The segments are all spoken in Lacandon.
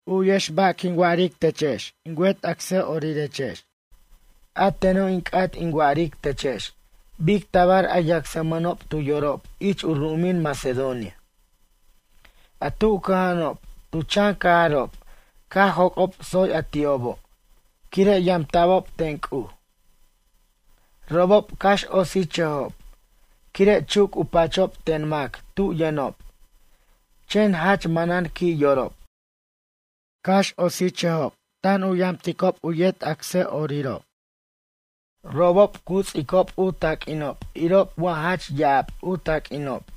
U'yex ba' quin wa'aric techex in wet acsa'orirex. A teno' in c'at in wa'aric techex bic tabar a yacsmʌnob tu yorob ich u ru'umin Macedonia, a tu cʌja'anob tu chan cajarob caj joc'ob tsoy a ti'obo' quire' yamta'bob ten C'uj. Robob cax otsichʌjob quire' chuc u pachob ten mac tu yʌnob, chen jach manan qui' yorob. Cax otsichʌjob, tan u yamticob u yet acsa'orirob. Robob cu ts'icob u taq'uinob irob wa jach ya'ab u taq'uinob.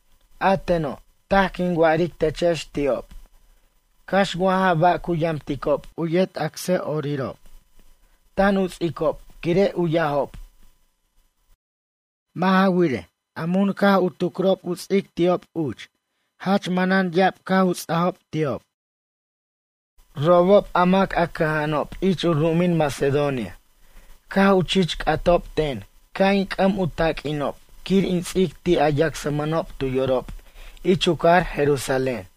A teno' taj quin wa'aric techex ti'ob, cax wa ja ba' cu yamticob u yet acsa'orirob tan u ts'icob quire' u yajob. Mʌ' ja wirej, a mun caj u tucrob u ts'ic ti'ob uch jach manan ya'ab caj u ts'ajob ti'ob. Robob, a mac a cʌja'anob ich u ru'umin Macedonia, caj u chich c'atob ten ca' in c'ʌm u taq'uinob quir in ts'ic ti' a yacsmʌnob tu yorob ich u cajar Jerusalén.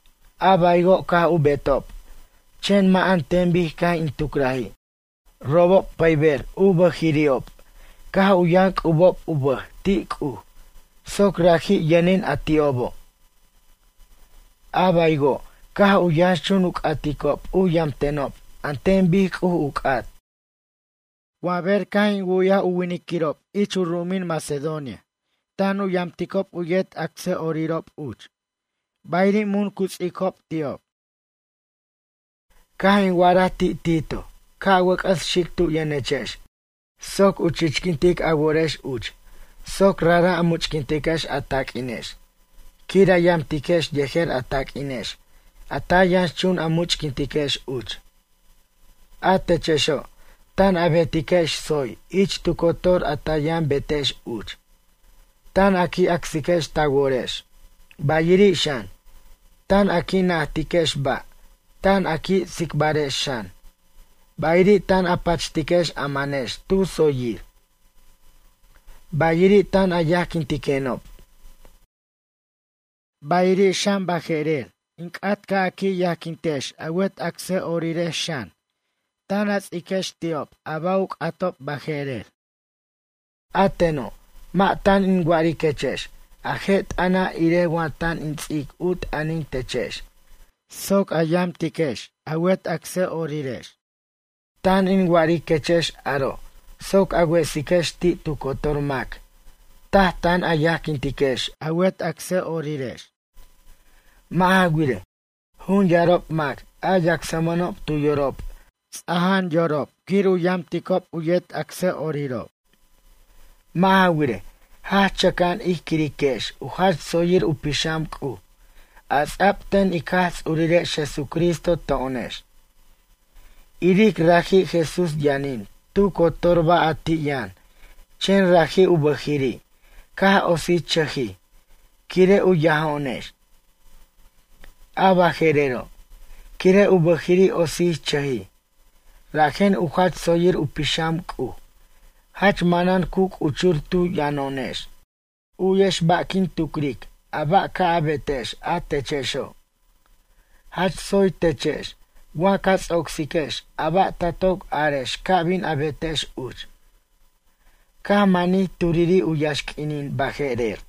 A baywo' caj u betob, chen mʌ' an ten bic caj in tucraji'. Robob pʌyber u bʌjirirob caj u yʌn c'ubob u bʌj ti' C'uj soc raji' yʌnin a ti'obo'. A baywo', caj u yʌnxchun u c'aticob u yamtenob an ten bic C'uj u c'at. Wa ber caj in wu'yaj winiquirob ich u ru'umin Macedonia tan u yamticob u yet acsa'orirob uch, bayiri' mun cu ts'icob ti'ob. Caj in wa'araj ti' Tito ca' wʌc'ʌs xic tu yʌnechex soc u chichquintic a worex uch soc rajra' a much'quintiquex a taq'uinex quir a yamtiquex yejer a taq'uinex a ta yʌnxchun a much'quintiquex uch. A techexo' tan a betiquex tsoy ich tu cotor a ta yʌn betex uch. Tan a qui' acsiquex ta worex, bayiri' xan, tan a qui' najtiquex ba', tan a qui' tsicbarex xan, bayiri' tan a pachtiquex a manex tu tsoyir. Bayiri' tan a yajquintiquenob. Bayiri' xan baje'rer, in c'at ca' a qui' yajquintex a wet acsa'orirex xan, tan a ts'iquex ti'ob a ba' u c'atob baje'rer. A teno', mʌ' tan in wa'ariquechex a je' t'ʌna' irej wa tan in ts'ic u t'ʌnin techex soc a yamtiquex a wet acsa'orirex. Tan in wa'ariquechex aro' soc a wesiquex ti' tu cotor mac taj tan a yajquintiquex a wet acsa'orirex. Mʌ' ja wirej, jun yarob mac a yacsmʌnob tu yorob ts'aja'an yorob quir u yamticob u yet acsa'orirob. Mʌ' ja wirej, jach chʌca'an ij quirex u jach tsoyir u pixam C'uj a ts'a'b ten ic Jaj Ts'urirex Jesucristo to'onex. Iric raji' Jesús yʌnin tu cotor ba' a ti' yʌn chen raji' u bʌjiri' caj otsichʌjij quire' u yajo'onex. A bʌje'rero', quire' u bʌjiri' otsichʌjij rajen u jach tsoyir u pixam C'uj jach manan cu c'uchur tu yʌno'onex. U'yex ba' quin tucric a ba' ca' a betex a techexo'. Jach tsoy techex wa ca ts'ocsiquex a ba' ta toc arex ca bin a betex uch, caj manij turiri' u yaxq'uinin baje'rer.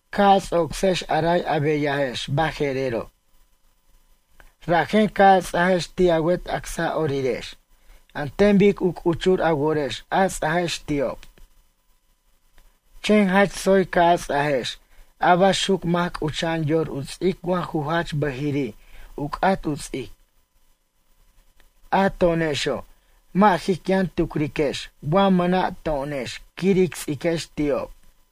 Ca' a ts'ocsex a ray a beyajex baje'rero'. Rajen ca' a ts'ajex ti' a wet acsa'orirex an ten bic u c'uchur a worex a ts'ajex ti'ob. Chen jach tsoy ca' a ts'ajex a baxuc mac c'ucha'an yor u ts'ic wa ju jach bʌjiri' u c'at u ts'ic. A to'onexo' mʌ' jic yʌn tucriquex wa mʌna' to'onex quir ic ts'iquex ti'ob.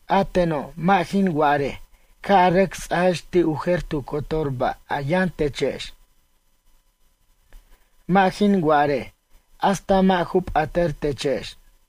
A teno' mʌ' jin wa'arej ca' a rʌc ts'ajex ti' u jer tu cotor ba' a yʌn techex. Mʌ' jin wa'arej hasta mʌ' ju p'atʌr techex.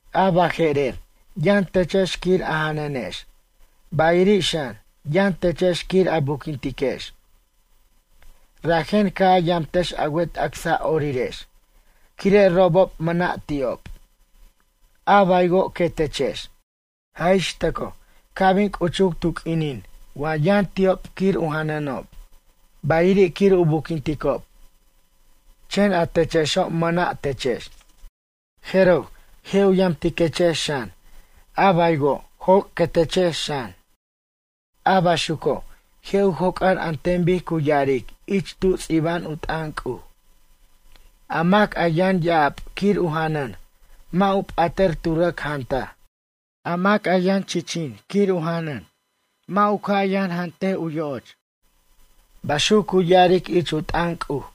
A baje'rer, yʌn techex quir a janʌnex, bayiri' xan yʌn techex quir a buquintiquex. Rajen ca' a yamtex a wet acsa'orirex quire' robob mʌna' ti'ob, a baywo' quetechex. Jaj ix tʌcoj ca' bin c'uchuc tu q'uinin wa yʌn ti'ob quir u janʌnob, bayiri' quir u buquinticob, chen a techexo' mʌna' techex. Jeroj je' u yamtiquechex xan, a baywo' joc' quetechex xan. A baxuco', je' u joc'ar an ten bic cu ya'aric ich tu ts'iba'an u t'ʌn C'uj: “A mac a yʌn ya'ab quir u janʌn mʌ' u p'atʌr tu rʌc jantaj. A mac a yʌn chichin quir u janʌn mʌ' u ca' yʌn jant u yo'och.” Baxuc cu ya'aric ich u t'ʌn C'uj.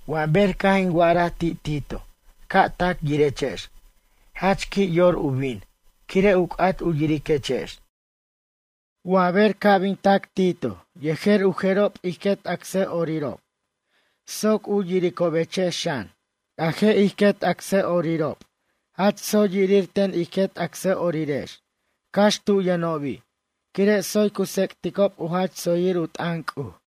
Wa ber caj in wa'araj ti' Tito ca' tac yirechex, jach qui' yor u bin, quire' u c'at u yiriquechex. Wa ber ca' bin tac Tito yejer u jerob ij quet acsa'orirob soc u yiricobechex xan. A je' ij quet acsa'orirex jach tsoy yirir ten ij quet acsa'orirex cax tu yʌnobi' quire' tsoy cu tsec'ticob u jach tsoyir u t'ʌn C'uj.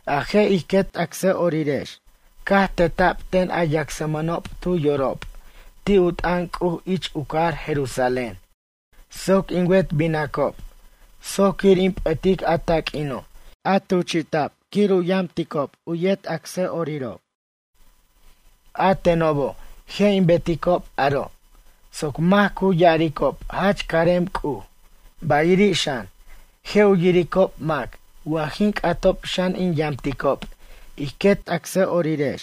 A je' ij quet acsa'orirex caj teta'b ten a yacsmʌnob tu yorob ti' u t'ʌn C'uj ich u cajar Jerusalén soc in wet binacob soc quir in p'ʌtic a taq'uino' a tuchi'ta'b quir u yamticob yet acsa'orirob. A tenobo' je' in beticob aro' soc mac cu ya'aricob jach carem C'uj, bayiri' xan, je' u yiricob mac wa jin c'atob xan in yamticob ij quet acsa'orirex.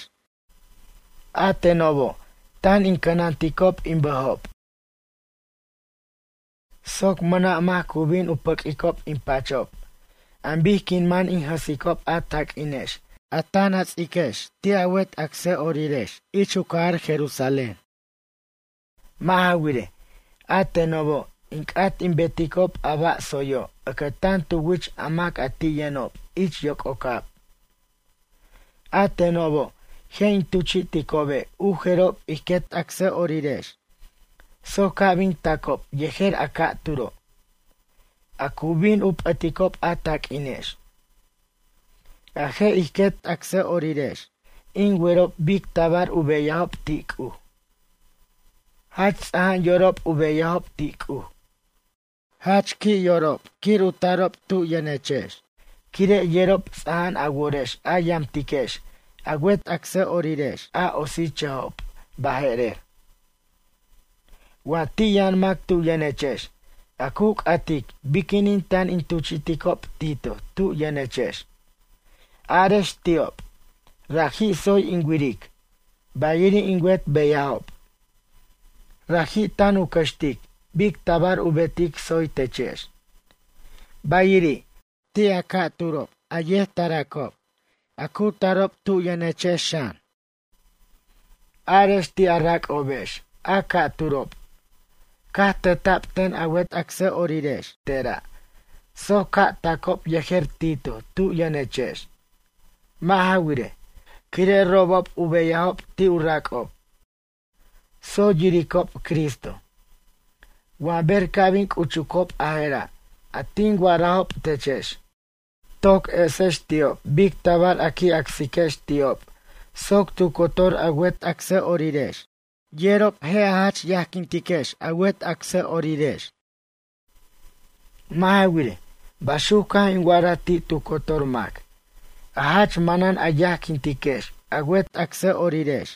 A tenobo' tan in cʌnanticob in bʌjob soc mʌna' mac cu bin u pʌq'uicob in pachob an bic quin man in jʌsicob a taq'uinex, a tan a ts'iquex ti' a wet acsa'orirex ich u cajar Jerusalén. Mʌ' ja wirej, a tenobo' in c'at in beticob a ba' tsoyo' ʌcʌtan tu wich a mac a ti' yʌnob ich yoc'ocab. A tenobo', je' in tuchi'ticobe' u jerob ij quet acsa'orirex soc ca' bin tacob yejer a ca'turo', a cu bin u p'ʌticob a taq'uinex. A je' ij quet acsa'orirex in werob bic tabar u beyajob ti' C'uj. Jach ts'aja'an yorob u beyajob ti' C'uj. Jach qui' yorob quir u tarob tu yʌnechex quire' yerob ts'aja'an a worex a yamtiquex a wet acsa'orirex a otsichʌjob baje'rer. Wa ti' yʌn mac tu yʌnechex a cu c'atic biquinin tan in tuchi'ticob Tito tu yʌnechex. Arex ti'ob, raji' tsoy in wiric, bayiri' in wet beyajob. Raji' tan u cʌxtic bic tabar u betic tsoy techex. Bayiri', ti' a ca'turob a yet taracob, a cu tarob tu yʌnechex xan. Arex ti' a rac'obex a ca'turob, caj teta'b ten a wet acsa'orirex tera' soc ca' tacob yejer Tito tu yʌnechex. Mʌ' ja wirej, quire' robob u beyajob ti' u rac'ob, tsoy yiricob Cristo. Wa ber ca' bin c'uchucob a jera' a tin wa'arajob techex, toc esex ti'ob bic tabar a qui' acsiquex ti'ob soc tu cotor a wet acsa'orirex yerob a jach yajquintiquex a wet acsa'orirex. Mʌ' ja wirej, baxuc caj in wa'araj ti' tu cotor mac, a jach manan a yajquintiquex a wet acsa'orirex.